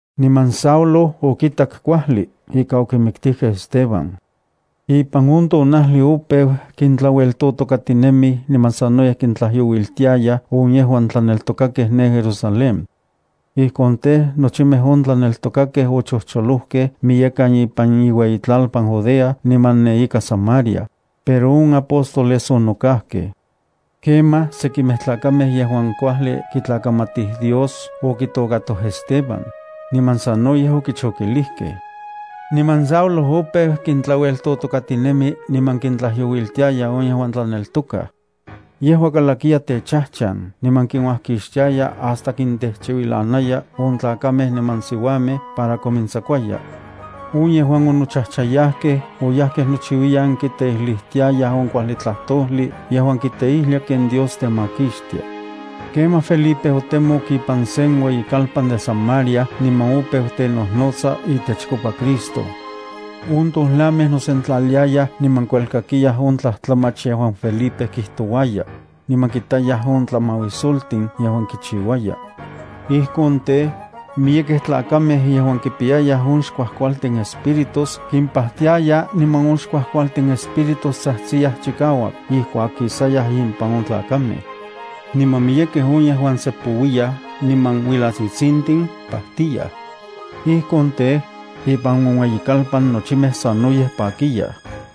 Niman Saulo okitak kuajli ika okimiktijkej Esteban. Saulo okintlaueltotokatinen niman okintlajyouiltij on yejuan tlaneltokaj Ipan on tonajli opeu kintlaueltotokatinemij niman sanoyej kintlajyouiltiayaj on yejuan tlaneltokakej ne Jerusalén. Ijkon tej, nochimej on tlaneltokakej ochojcholojkej miyekan ipan iueyitlalpan Judea niman ne ika Samaria, pero on apóstoles onokajkej. Kemaj sekimej tlakamej yejuan kuajli kitlakamatij Dios okitokatoj Esteban, niman sanoyej okichokilijkej. Niman Saulo opeu kintlaueltotokatinemi niman kintlajyouiltiaya on yejuan tlaneltokaj. Yejua kalakiya techajchan niman kinuajkixtiaya hasta kintejchiuilanaya on tlakamej niman siuamej para komintsakuaya. On yejuan onochajchayajkej oyajkej nochiuiyan kiteijlijtiayaj on kuajli tlajtojli yejuan kiteijlia ken Dios temakixtia. Kemaj Felipe otemok ipan sen ueyikalpan de Samaria niman opeu tenojnotsa itechkopa Cristo. On tojlamej nosentlaliayaj niman kuelkakiyaj on tlajtlamach yejuan Felipe kijtouaya, niman kitayaj on tlamauisoltin yejuan kichiuaya. Ijkon tej, miyekej tlakamej yejuan kipiyayaj on xkuajkualtin espíritus kimpajtiaya niman on xkuajkualtin espíritus tsajtsiyaj chikauak ijkuak kisayaj impan on tlakamej. Niman miyekej on yejuan sepouiyaj niman uilatsitsintin pajtiaya. Ijkon tej, ipan on ueyikalpan nochimej sanoyej pakiyaj.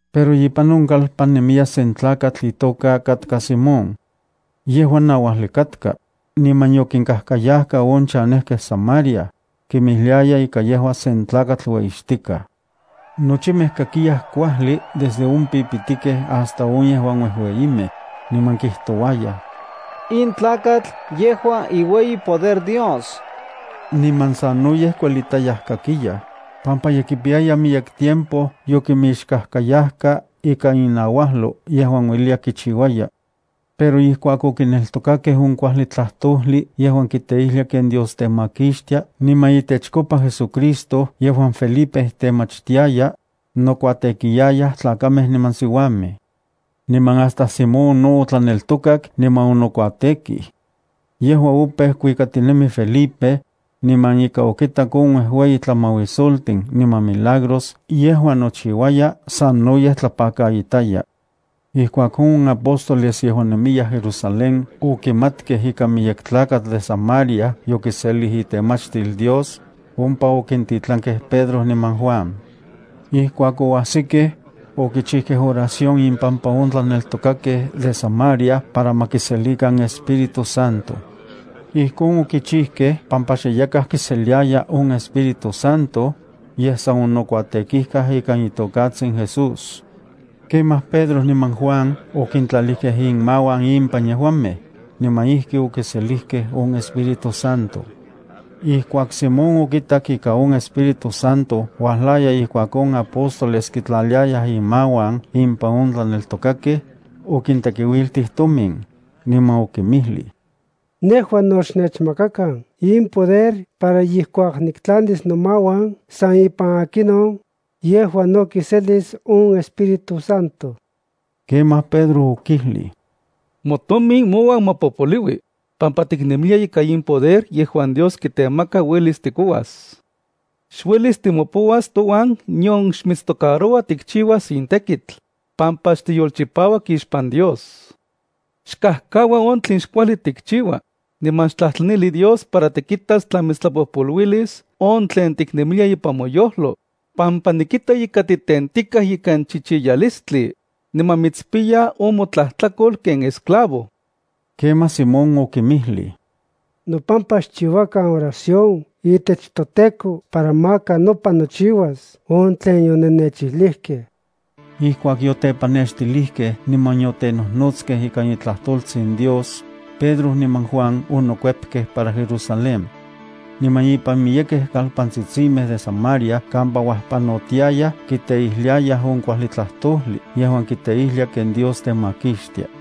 Pero ipan on kalpan nemiya sen tlakatl itoka katka Simón. Yejua nauajli katka, niman yokinkajkayajka on chanejkej Samaria, kinmijliaya ika yejua sen tlakatl ueyixtikaj. Nochimej kakiyaj kuajli desde on pipitikej hasta on yejuan uejueyimej, niman kijtouayaj: “In tlakatl yejua iueyi poder Dios.” Niman sanoyej kuelitayaj kakiyaj, pampa ye kipiyaya miyek tiempo yokimixkajkayajka ika inauajlo yejuan ueliya kichiuaya. Pero ijkuak okineltokakej on kuajli tlajtojli yejuan kiteijlia ken Dios temakixtia niman itechkopa JesuCristo yejuan Felipe temachtiaya, nokuatekiyayaj tlakamej niman siuamej. Niman hasta Simón no otlaneltokak niman onokuatekij. Yejua opeu kuikatinemi Felipe, niman ika okitak on uejueyi tlamauisoltin niman milagros yejuan nochiuaya sanoyej tlapakaitaya. Ijkuak on apóstoles yejuan nemiyaj Jerusalén okimatkej ika miyek tlakatl de Samaria yokiselij itemachtil Dios, ompa okintitlankej Pedro niman Juan. Ijkuak oajsikej, okichijkej oración impampa on tlaneltokakej de Samaria para ma kiselikan Espíritu Santo. Ijkon okichijkej pampa xe yakaj kiseliaya on Espíritu Santo, yej san onokuatekijkaj ikan itokatsin Jesús. Kemaj Pedro niman Juan okintlalijkej inmauan impan yejuamej, niman ijki okiselijkej on Espíritu Santo. Ijkuak Simón okitak ika on Espíritu Santo uajlaya ijkuak on apóstoles kitlaliayaj inmauan impan on tlaneltokakej, okintekiuiltij tomin, niman okinmijlij: —Nejua no xnechmakakan in poder para ijkuak niktlalis nomauan san ipan akinon, yejua no kiselis on Espíritu Santo. Kemaj Pedro okijlij: —Motomin mouan ma popoliui, pampa tiknemilia ika in poder yejuan Dios kitemaka uelis tikouas. Xuelis timopouas touan nion xmitstocaroua tikchiuas in tekitl, pampa xtiyolchipauak ixpan Dios. Xkajkaua on tlen xkuajli tikchiua, niman xtlajtlanili Dios para tikitas tla mitstlapojpoluilis on tlen tiknemilia ipan moyojlo, pampa nikita ika titentikaj ikan chichiyalistli, niman mitspiya on motlajtlakol ken esclavo. Kemaj Simón okinmijlij: —Nopampa xchiuakan oración itech toTEKO para maka nopan nochiuas on tlen yonennechijlijkej. Ijkuak yotepannextilijkej niman yotenojnotskej ikan itlajtoltsin Dios, Pedro niman Juan onokuepkej para Jerusalén. Niman ipan miyekej kalpantsitsimej de Samaria kampa uajpanotiayaj kiteijliayaj on kuajli tlajtojli yejuan kiteijlia ken Dios temakixtia.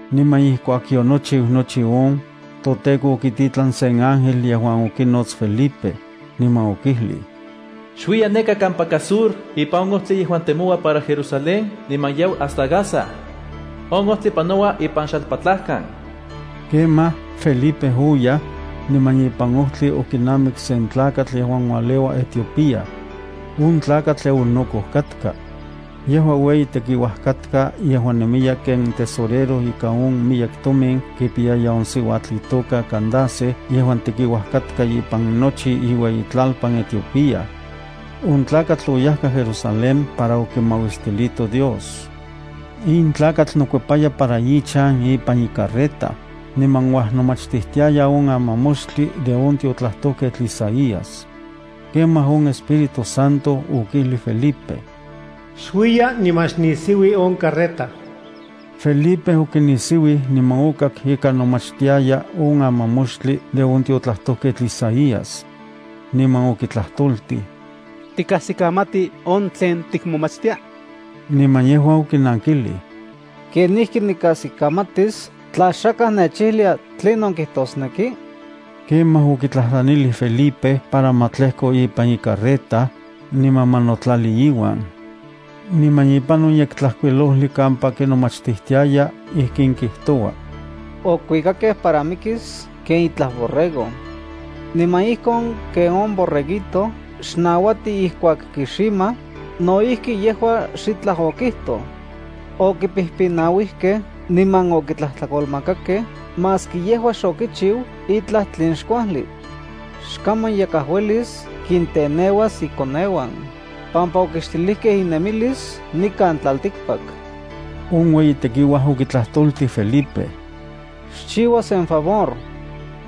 Niman ijkuak yonochiu nochi on, toTEKO okititlan sen ángel yejuan okinots Felipe, niman okijlij: —Xuiya neka kampaka sur ipan on ojtli yejuan temoua para Jerusalén niman yau hasta Gaza. On ojtli panoua ipan xalpatlajkan. Kemaj, Felipe oyaj, niman ipan ojtli okinamik sen tlakatl yejuan ualeua Etiopía. On tlakatl eunuco katka. Yejua ueyi tekiuaj katka yejuan nemiya ken tesorero ika on miyek tomin kipiyaya on siuatl itoka Candace yejuan tekiuaj katka ipan nochi iueyitlalpan Etiopía. On tlakatl oyajka Jerusalén para okimauistilito Dios. In tlakatl nokuepaya para ichan ipan icarreta, niman uajnomachtijtiaya on amamoxtli de on tiotlajtojketl Isaías. Kemaj on Espíritu Santo okijlij Felipe: —Xuiya niman xnisiui on carreta. Felipe okinisiuij niman okak ika nomachtiaya on amamoxtli de on tiotlajtojketl Isaías. Niman okitlajtoltij: —¿Tikajsikamati on tlen tikmomachtia? Niman yejua okinankilij: —¿Kenijki nikajsikamatis tla xakaj nechijlia tlinon kijtosneki? Kemaj okitlajtlanilij Felipe para ma tlejko ipan icarreta, niman ma notlali iuan. Niman ipan on Yektlajkuilojli kampa kinomachtijtiaya ijkin kijtoua: Okuikakej para mikis ken itlaj borrego. Niman ijkon ken on borreguito xnauati ijkuak kiximaj, no ijki yejua xitlaj okijtoj. Okipijpinauijkej niman okitlajtlakolmakakej maski yejua xokichiu itlaj tlen xkuajli. Xkaman yakaj uelis kinteneuas ikoneuan, pampa okixtilijkej inemilis nikan tlaltikpak. On ueyi tekiuaj okitlajtoltij Felipe: —Xchiua sen favor.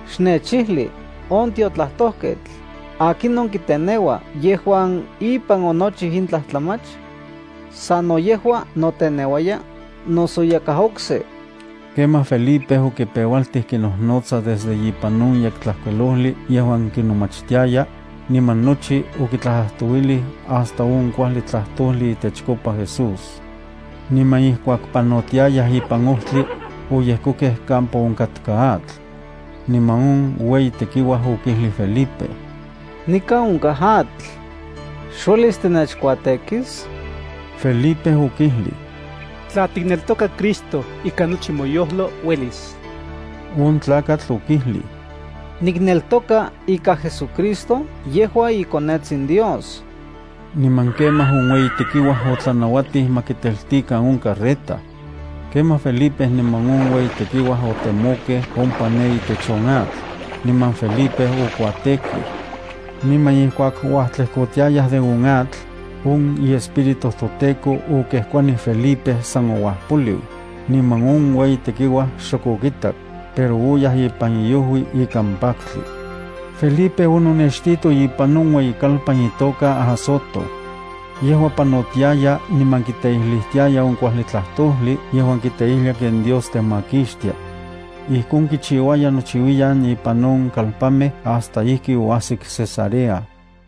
Xnechijli, on tiotlajtojketl, ¿akinon kiteneua yejuan ipan onochiu in tlajtlamach? ¿Sano yejua noteneuaya, noso yakaj okse? Kemaj Felipe okipeualtij kinojnotsa desde ipan on Yektlajkuilojli yejuan kinomachtiaya, niman nochi okitlajtlajtouilij hasta on kuajli tlajtojli itechkopa Jesús. Niman ijkuak panotiayaj ipan ojtli, oyejkokej kampa onkatka atl. Niman on ueyi tekiuaj okijlij Felipe: —Nikan onkaj atl. ¿Xuelis tinechkuatekis? Felipe okijlij: —Tla tikneltoka Cristo ikan nochi moyojlo, uelis. On tlakatl okijlij: —Nikneltoka ika JesuCristo yejua iKonetsin Dios. Niman kemaj on ueyi tekiuaj otlanauatij ma kiteltikan on carreta. Kemaj Felipe niman on ueyi tekiuaj otemokej ompa ne itech on atl, niman Felipe okuatekij. Niman ijkuak uajtlejkotiayaj de on atl, on iEspíritu toTEKO okejkuanij Felipe san ouajpoliu, niman on ueyi tekiuaj xok okitak, pero oyaj ipan iojui ikan paktli. Felipe ononextito ipan on ueyikalpan itoka Azoto. Yejua panotiaya niman kiteijlijtiaya on kuajli tlajtojli yejuan kiteijlia ken Dios temakixtia. Ijkon kichiuaya nochiuiyan ipan on kalpanmej hasta ijki oajsik Cesarea.